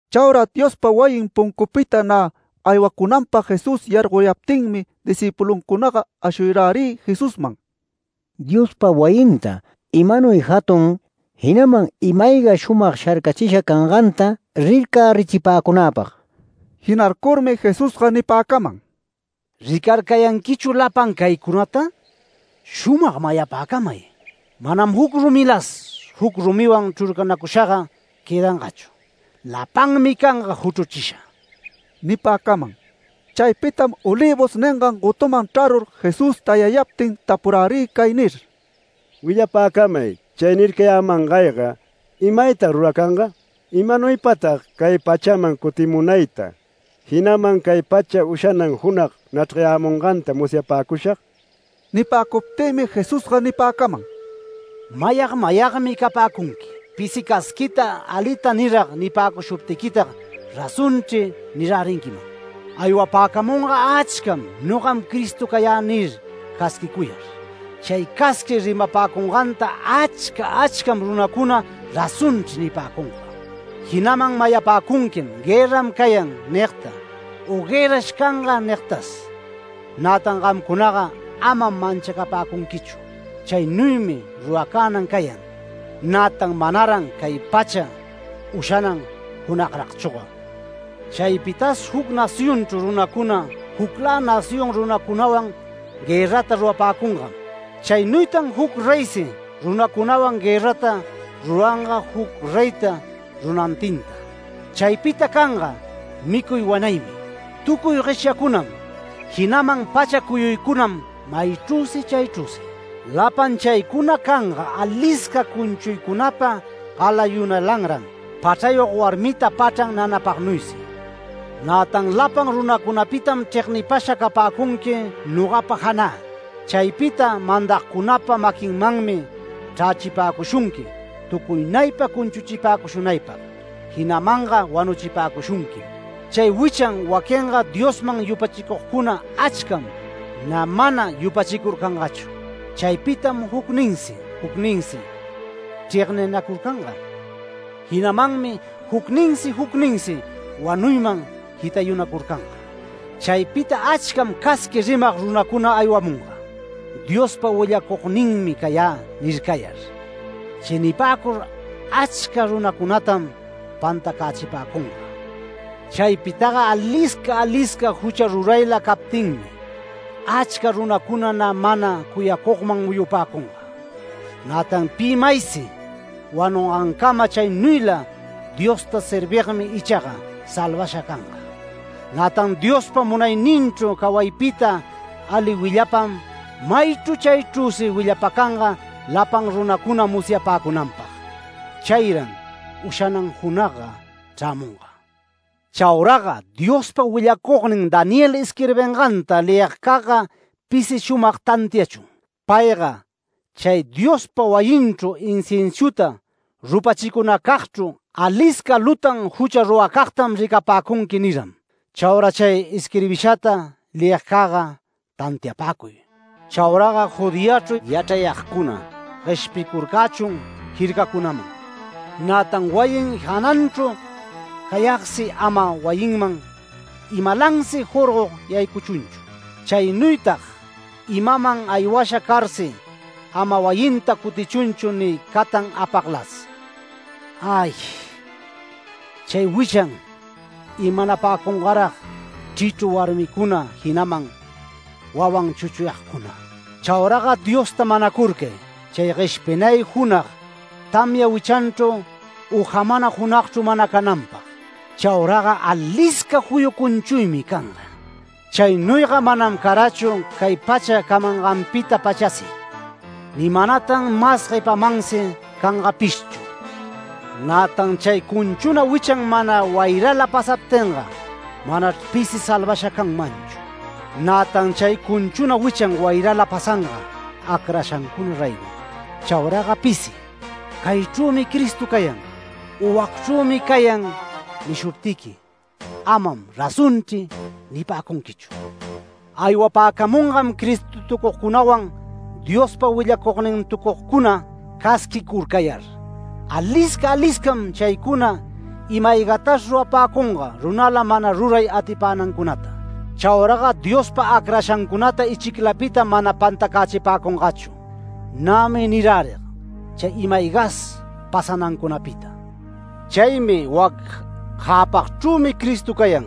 Chaura Diospa wayin puncupita nä aywacunanpag Jesús yargoyaptinmi discïpuluncunaga ashuyärï Jesusman “¡Diospa wayinta! ¡Imanuy jatun, jinaman ima-ayga shumag sharcachisha canganta rircärichipäcunäpag!” Jinarcurmi Jesusga nipäcaman: “¿Ricarcanquichu lapan caycunata? Shumag mayapäcamay: Manam juc rumilas juc rumiwan chrurcanacushaga quëdangachu. Lapanmi canga juchruchisha” nipäcaman. Chaypitam Olivos ningan gotuman chrarur Jesús tayayaptin tapurärï cay nir: “Willapäcamay chay nircayämangayga. ¿Imaytag ruracanga? ¿Imanuypatag cay pachaman cutimunayta, jinaman cay pacha ushanan junag nachrgayämunganta musyapäcushag?” Nipäcuptïmi Jesusga nipäcaman: “¡Mayag mayagmi capäcunqui! Pisi casquita alita nirag nipäcushuptiquitag ‘Razonchri’ nirärinquiman. Aywapäcamunga achcam ‘Nogam Cristo cayä’ nir casquicuyar. Chay casqui rimapäcunganta achca achca runacunam ‘Razonchri’ nipäcunga. Jinaman mayapäcunquim ‘Guërram cayan’ nigta u ‘Guërrash canga’ nigtas. Nätan gamcunaga amam manchacapäcunquichu. Chaynuymi ruracänan cayan, nätan manaran cay pacha ushanan junagragchüga. Chaypitas juc nacionchru runacuna juclä nación runacunawan guërrata rurapäcungam. Chaynuytan juc reysi runacunawan guërrata ruranga juc reyta runantinta. Chaypita canga micuy wanaymi tucuy gueshyacunam jinaman pacha cuyuycunam maychrüsi chaychrüsi. Lapan chaycuna canga alisca cunchuycunapa galayunalanran, pachrayog warmita pachran nanapagnuysi. Nätan lapan runacunapitam chregnipasha capäcunqui nogapa janä. Chaypita mandagcunapa maquinmanmi chrächipäcushunqui tucuynaypa cunchuchipäcushunaypag jinamanga wanuchipäcushunquim. Chay wichan waquinga Diosman yupachicugcuna achcam nä mana yupachicurcangachu. Chaypitam jucninsi jucninsi chregninacurcanga, jinamanmi jucninsi jucninsi wanuyman jitayunacurcanga. Chaypita achcam casqui rimag runacuna aywamunga ‘Diospa willacugninmi cayä’ nircayar. Chay nipäcur achca runacunatam pantacächipäcunga. Chaypitaga alisca alisca jucha rurayla captinmi, achca runacuna nä mana cuyacugman muyupäcunga. Nätan pi maysi wanungancama chaynuyla Diosta servigmi ichaga salvasha canga. Nätan Diospa munayninchru cawaypita ali willapam maychru chaychrüsi willapacanga lapan runacuna musyapäcunanpag. Chayran ushanan junagga chrämunga. ¡Chauraga Diospa willacugnin Daniel isquirbinganta leyigcagga pisi shumag tantiachun! Payga ‘Chay Diospa wayinchru inciensuta rupachicunacagchru alisca lutan jucha ruracagtam ricapäcunqui’ niram. (Chaura chay isquirbishata leyigcagga tantiapäcuy.) Chauraga Judeachru yachrayagcuna gueshpicurcächun jircacunaman. Nätan wayin jananchru cayagsi ama wayinman imalansi jorgog yaycuchunchu. Chaynuytag imaman aywasha carsi ama wayinta cutichunchu ni catan apaglas. ¡Ay, chay wichan imanapäcungarag chrichru warmicuna jinaman wawan chuchuyagcuna! Chauraga Diosta manacurcay chay gueshpinay junag tamya wichanchru u jamana junagchru mana cananpag. Chauraga alisca juyu cunchuymi canga. Chaynuyga manam carachu cay pacha camanganpita-pachasi, ni manatan mas guepamansi cangapishchu. Nätan chay cunchuna wichan mana wayrala pasaptinga manachr pisi salvasha canmanchu. Nätan chay cunchuna wichan wayrala pasanga acrashancuna raygom. Chauraga pisi ‘Caychrümi Cristo cayan’ u ‘Wacchrümi cayan’ nishuptiqui ‘Amam razonchri’ nipäcunquichu. Aywapäcamungam ‘Cristotucugcunawan’, ‘Diospa willacugnintucugcuna’, casquicurcayar. Alisca aliscam chaycuna ima-aygatas rurapäcunga runala mana ruray atipänancunata. Chauraga Diospa acrangancunata ichiclapitam mana pantacächipäcungachu. Nämi nirärig chay ima-aygas pasanancunapita. Chaymi ‘¡Wac jäpagchrümi Cristo cayan!’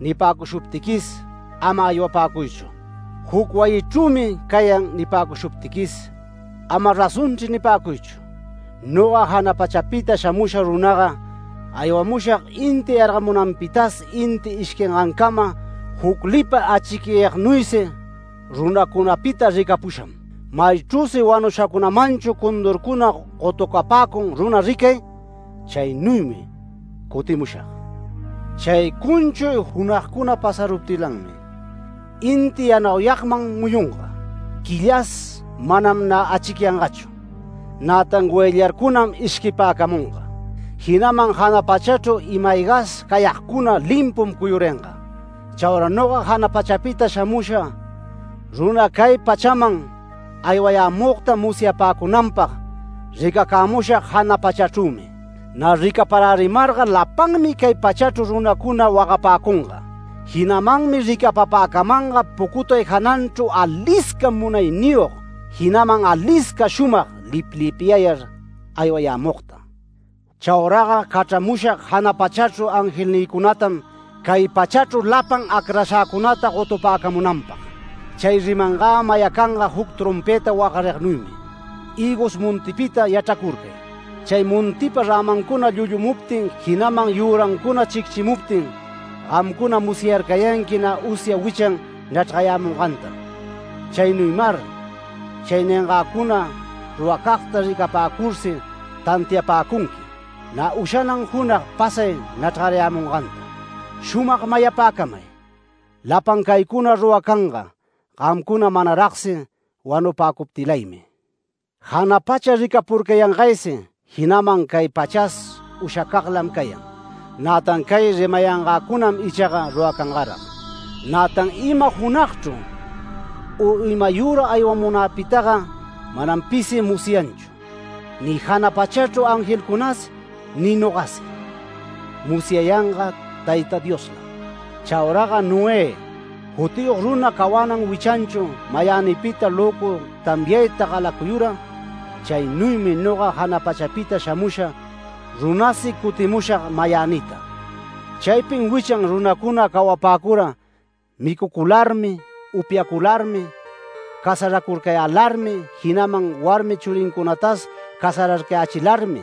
nipäcushuptiquis, ama aywapäcuychu, u ‘¡Wac wayichrümi cayan!’ nipäcushuptiquis, ama ‘Razonchri’ nipäcuychu. Noga jana pachapita shamusha runaga aywamushag inti yargamunanpita inti ishquinancama juc lipa achicyagnuysi runacunapita ricapusham. Maychrüsi wanushacagmanchu condurcuna gotucapäcun runa ricay, chaynuymi cutimushag”. “Chay cunchuy junagcuna pasaruptilanmi, inti yanauyagman muyunga, quillas manam nä achicyangachu, nätan goyllarcunam ishquipäcamunga, jinaman jana pachachru ima-aygas cayagcunam limpu cuyuringa. Chaura noga jana pachapita shamusha runa cay pachaman aywayämugta musyapäcunanpag ricacämushag jana pachachrümi. Nä ricaparärimarga lapanmi cay pachachru runacuna wagapäcunga. Jinamanmi ricapapäcamanga pucutay jananchru alisca munayniyog, jinaman alisca shumag liplipyayar aywayämugta. Chauraga cachramushag jana pachachru angelnïcunatam cay pachachru lapan acrashäcunata gotupäcamunanpag. Chay rimangä mayacanga juc trompëta wagarignuymi. Hïgos montipita yachracurcay. Chay montipa rämancuna llullumuptin jinaman yürancuna chicchimuptin, gamcuna musyarcayanqui nä usya wichan nachrgayämungantam. Chaynuymar chay niyangäcuna ruracagta ricapäcursi tantiapäcunqui, nä ushanan junag pasay nachrgarayämunganta. Shumag mayapäcamay: Lapan caycuna ruracanga, gamcuna manaragsi wanupäcuptilaymi. Jana pacha ricapurcayangaysi, jinaman cay pachas ushacaglam cayan, nätan cay rimayangäcunam ichaga ruracangarag. Nätan ima junagchru u imayüra aywamunäpitaga manam pisi musyanchu, ni jana pachachru angelcunas ni nogasi. Musyayanga Tayta Dioslam. Chauraga Noé jutiyog runa cawanan wichanchu mayänipita löcu tamyayta galacuyura, chaynuymi noga jana pachapita shamusha runasi cutimushag mayänita. Chaypin wichan runacuna cawapäcura micucularmi upyacularmi casaracurcayälarmi jinaman warmi churincunatas casararcayächilarmi,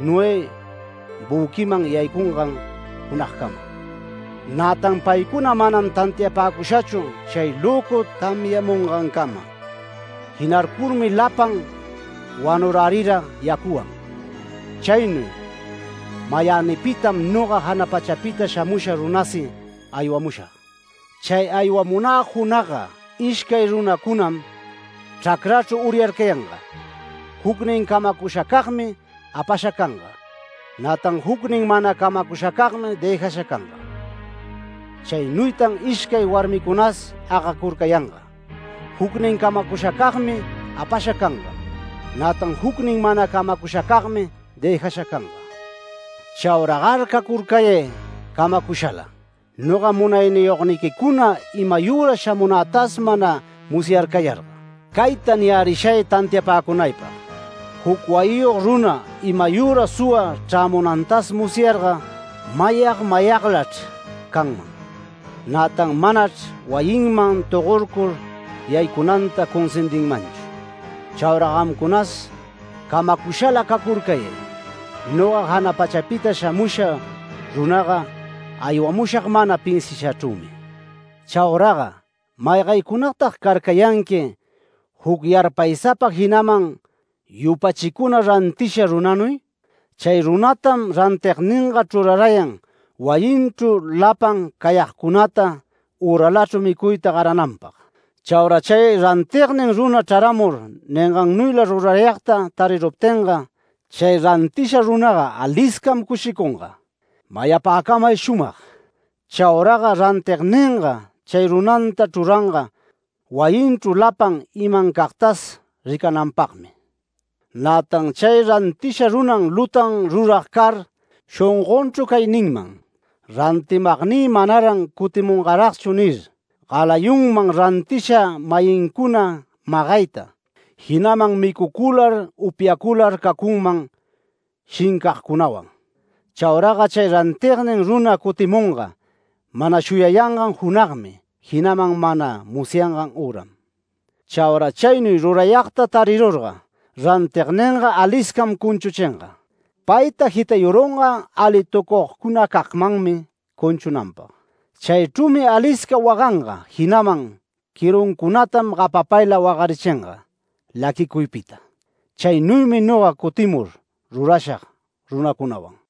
Noé büquiman yaycungan junagcama. Nätan paycuna manam tantiapäcushachu chay löcu tamyamungancama. Jinarcurmi lapan wanurärira yacuwan. Chaynuy mayänipitam noga jana pachapita shamusha runasi aywamushag. Chay aywamunä junagga ishcay runacunam chracrachru uryarcayanga. Jucnin camacushacagmi apasha canga, nätan jucnin mana camacushacagmi dëjasha canga. Chaynuytan ishcay warmicunas agacurcayanga. Jucnin camacushacagmi apasha canga. Nätan jucnin mana camacushacagmi dëjasha canga. ¡Chauragar cacurcayay camacushala! Noga munayniyogniquicuna imayüra shamunätas mana musyarcayarga. ¡Cayta niyärishay tantiapäcunaypag! Juc wayiyog runa imayüra suwa chrämunantas musyarga mayag mayaglachr canman, nätan manachr wayinman togorcur yaycunanta cunsindinmanchu. ¡Chaura gamcunas camacushala cacurcayay! Noga jana pachapita shamusha runaga aywamushag mana pinsiashachrümi”. “¿Chauraga maygaycunatag carcayanqui juc yarpaysapa jinaman yupachicuna rantisha runanuy? Chay runatam rantigninga chrurarayan wayinchru lapan cayagcunata üralachru micuyta garananpag. Chaura chay rantignin runa chraramur ningannuyla rurayagta tariruptinga, chay rantisha runaga aliscam cushicunga. Mayapäcamay shumag: Chauraga rantigninga chay runanta chruranga wayinchru lapan imancagtas ricananpagmi. Nätan chay rantisha runa lutan rurag car shongonchru cay ninman: ‘Rantimagnï manaran cutimunmanragchu’ nir. Galayunman rantisha-mayincuna magayta, jinaman micucular upyacular cacunman shincagcunawan. Chauraga chay rantignin runa cutimunga mana shuyayangan junagmi jinaman mana musyangan üram. Chaura chaynuy rurayagta tarirurga, rantigninga aliscam cunchuchinga. Payta jitayurunga alitucugcunacagmanmi cunchunanpag. Chaychrümi alisca waganga, jinaman quiruncunatam gapapayla wagarichinga laquicuypita. Chaynuymi noga cutimur rurashag runacunawan”.